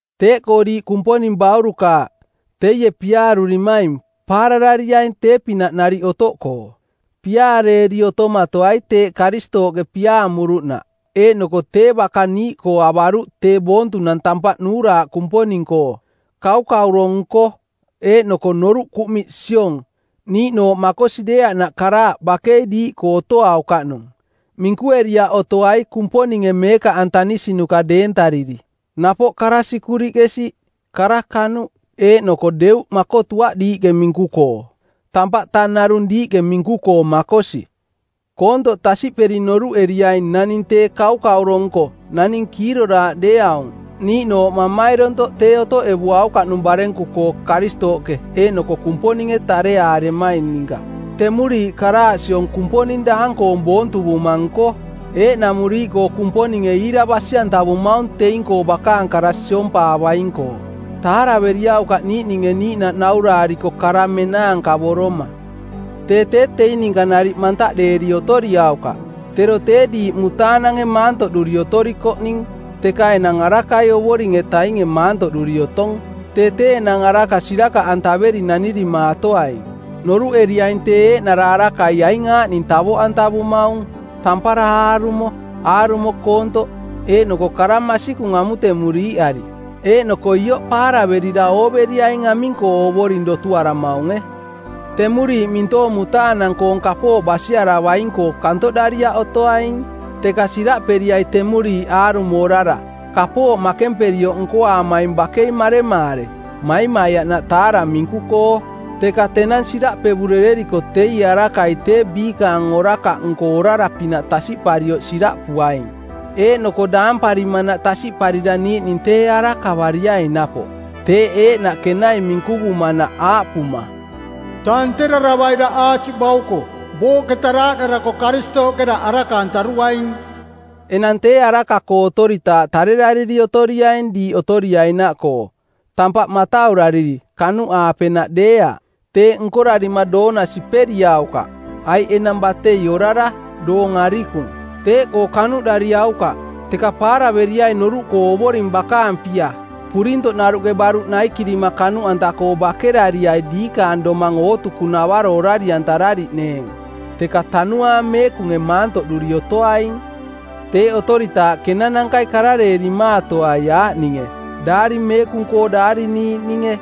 Teeꞌkoo diiꞌ Kumponing baurukaaꞌ, teie piaarurimaing, paararariaing tee-pinaꞌ nariꞌ otoꞌkoo. Piaareeri otomatoai teeꞌ Karistooꞌke piaamuruꞌnaꞌ eeꞌnoko tee baka niiꞌkoo avaruꞌ tee boontunang tampaꞌ nuuraaꞌ Kumponing-koo. Kaukauro-nko, eeꞌnoko noruꞌ kuꞌmiꞌ siong, niiꞌnooꞌ makosi deeaꞌnaꞌ karaaꞌ bakei diiꞌkoo otoaukaꞌnung; minkueriaꞌ otoai Kumponinge meekaꞌantanisinuka deentariri. Napoꞌ kara sikuriꞌke siꞌ, kara kanuꞌ eeꞌnoko deuꞌ makotuaꞌ diiꞌke minku-koo. Tampaꞌ tang narung diiꞌke minku-koo makosi. Koontoꞌ tasiꞌperi noruꞌeriaing naning tee kaukauro-nko, naning kiiroraaꞌ deeaung, niiꞌnooꞌ mamairontoꞌ tee otoꞌevuaukaꞌnung barenku-koo Karistooꞌke eeꞌnoko Kumponinge tareaaremaing ninka. Temuriiꞌ karaaꞌ siong kumponing daang-koong boontuvuma-nko. Eeꞌnamuriiꞌkoo Kumponinge iira basi-antavumaung teing-koo bakaang kara siompaavaing-koo. Taaraveriaukaꞌ niiꞌninge niiꞌnaꞌ nauraariko kara menaankavoroma. Tee tee teing ninka nariꞌ mantaꞌdeeri otoriaukaꞌ. Tero tee diiꞌ mutaanange maantoꞌduri otorikoꞌning, teka enang arakai Ovoring-etainge maantoꞌduri otong. Tee tee enang araka sirakaꞌantaveri nanirimaatoaing. Noruꞌeriaing tee eeꞌnara arakai aing aaꞌning tavoꞌantavumaung: tampara aarumo, aarumo koontoꞌ eeꞌnoko kara masikung amutemuriiꞌari. Eeꞌnoko ioꞌ paaraverira ooveriaing aming-koo Ovoring dotuaramaunge. Temuriiꞌ mintoong mutaanang-koong kapooꞌ basiaravaing-koo kantoꞌdariaꞌ otoaing, teka siraꞌperiai temuriiꞌ aarumo orara. Kapooꞌ makemparioꞌ nkoaamaing bakei maremaare, maimaiaꞌnaꞌ taara minku-koo. Teka tenang siraꞌpevurereriko teie arakai tee biikaang orakaꞌnko orara-pinaꞌ tasiꞌparioꞌ siraꞌpuaing. Eeꞌnoko daamparimanaꞌ tasiꞌparira niiꞌning tee arakavariaing napoꞌ. Teeꞌ eeꞌnaꞌ kenai minkuvumanaꞌ aaꞌpuma, “Tanteraravai daꞌ aasiꞌ bauko. Booꞌketa daaꞌdarako Karistooꞌke daꞌ araka-antaruaing.” Enang tee araka-koo otoritaaꞌ tarerariri otoriaing diiꞌ otoriainaꞌkoo, tampaꞌ mataurariri, kanuꞌaapenaꞌ deeaꞌ. Teeꞌ nkorarima doona siperiaukaꞌ, aiꞌ enang batei orara, doong arikung. Teeꞌkoo kanuꞌdariaukaꞌ, teka paaraveriai noruꞌkoo Ovoring bakaang pia. Purintoꞌnaruꞌke baruꞌ naikirima kanuꞌanta-koo bakerariai diikaang domang ootukunavaro orari-antarariꞌneeng, teka Tanuaang Meekunge maantoꞌduri otoaing. Teeꞌ otoritaaꞌ kenanankai karareerimaatoai aaꞌninge Daari Meekung-koo daariniiꞌninge,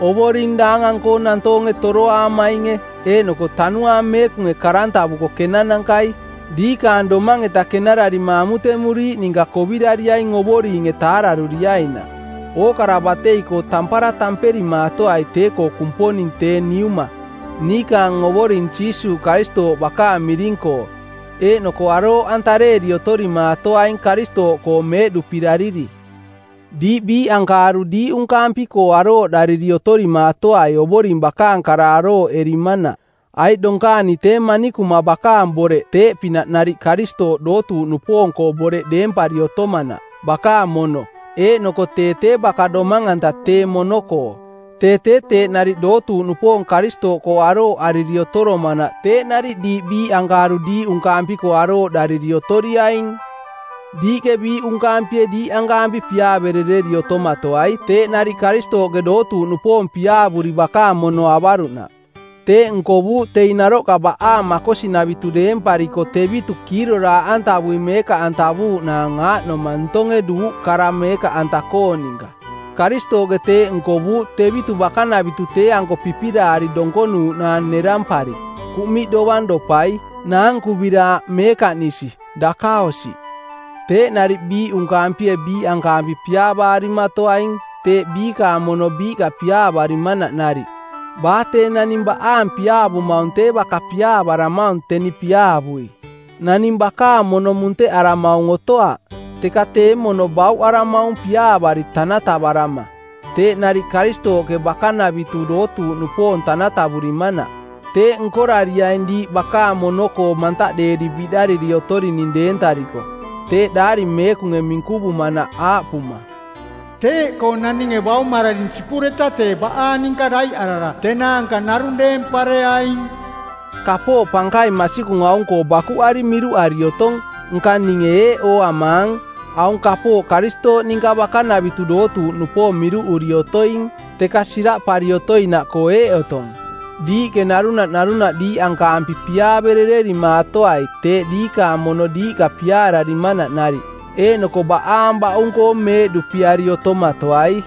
Ovoring daangang-koo nantoonge toroaamainge eeꞌnoko Tanuaang Meekunge karantavuko˜ kenanankai. Diikaang domang-eta kenararima amutemuriiꞌ ninka kovirariaing Ovoringe taararuriainaꞌ. Ookara batei-koo tampara tamperimaatoai tee-koo Kumponing tee Niuma, niikaang Ovoring Jiisuuꞌ Karistooꞌ bakaang miring-koo. Eeꞌnoko arooꞌantareeri otorimaatoaing Karistooꞌkoo meeꞌduꞌpirariri. Diiꞌ biiꞌankaaruꞌ diiꞌunkaampi-koo arooꞌdariri otorimaatoai Ovoring bakaang kara arooꞌerimanaꞌ, aiꞌ donkaani tee manikuma bakaang boreꞌ teeꞌpinaꞌ nariꞌ Karistooꞌ dootuuꞌnupoong-koo boreꞌ deempari otomanaꞌ, bakaang mono, eeꞌnoko tee tee baka domang-anta tee mono-koo. Tee tee teeꞌ nariꞌ dootuuꞌnupoong Karistooꞌkoo arooꞌariri otoromanaꞌ teeꞌ nariꞌ diiꞌ biiꞌankaaruꞌ diiꞌunkaampi-koo arooꞌdariri otoriaing. Diiꞌke biiꞌunkaampie diiꞌankaampi piaaverereri otomatoai teeꞌ nariꞌ Karistooꞌke dootuuꞌnupoong piaavuri bakaang mono avaruꞌnaꞌ. Teeꞌ nkovuuꞌ teing naroꞌka baꞌaang makosinavitu deempariko tevitu kiiroraaꞌantavui meekaꞌantavuuꞌnaang aaꞌnoma ntonge duuꞌ kara meekaꞌanta-koong ninka. Karistooꞌke teeꞌ nkovuuꞌ tevitu bakanavitu tee-anko pipiraari donkonuuꞌnaang nerampari, kuꞌmiꞌ dovang dopai, naankuviraaꞌ, meekaꞌnisi, dakaosiꞌ. Teeꞌ nariꞌ biiꞌunkaampie biiꞌankaampi piaavaarimatoaing, teeꞌ biikaang mono biiꞌka piaavarimanaꞌ nariꞌ. Baa tee naning baꞌaang piaavumaung tee baka piaavaramaung teni piaavui. Naning bakaang mono munteꞌaramaung otoaꞌ, teka tee mono bauꞌaramaung piaavari tanatavarama, teeꞌ nariꞌ Karistooꞌke bakanavitu dootuuꞌnupoong tanatavurimanaꞌ. Teeꞌ nkorariaing diiꞌ bakaang mono-koo mantaꞌdeeri biꞌdariri otorining deentariko. Teeꞌ Daari Meekunge minkuvumanaꞌ aaꞌpuma, “Teeꞌkoo naninge baumararing sipureta tee baꞌaang ninka daiꞌarara tenaanka narung deempareaing.” Kapooꞌ pankaing masikung aung-koo bakuꞌari miruꞌari otong, nka ninge eeꞌ ooamaang: Aung kapooꞌ Karistooꞌ ninka bakanavitu dootuuꞌnupoong miruꞌuri otoing. Teka siraꞌpari otoinaꞌkoo eeꞌ otong: Diiꞌke narunaꞌ narunaꞌ diiꞌankaampi piaaverererimaatoai teeꞌ diikaang mono diiꞌka piaararimanaꞌ nariꞌ. Eeꞌnoko baꞌaang baꞌung-koo meeꞌduꞌpiari otomatoai.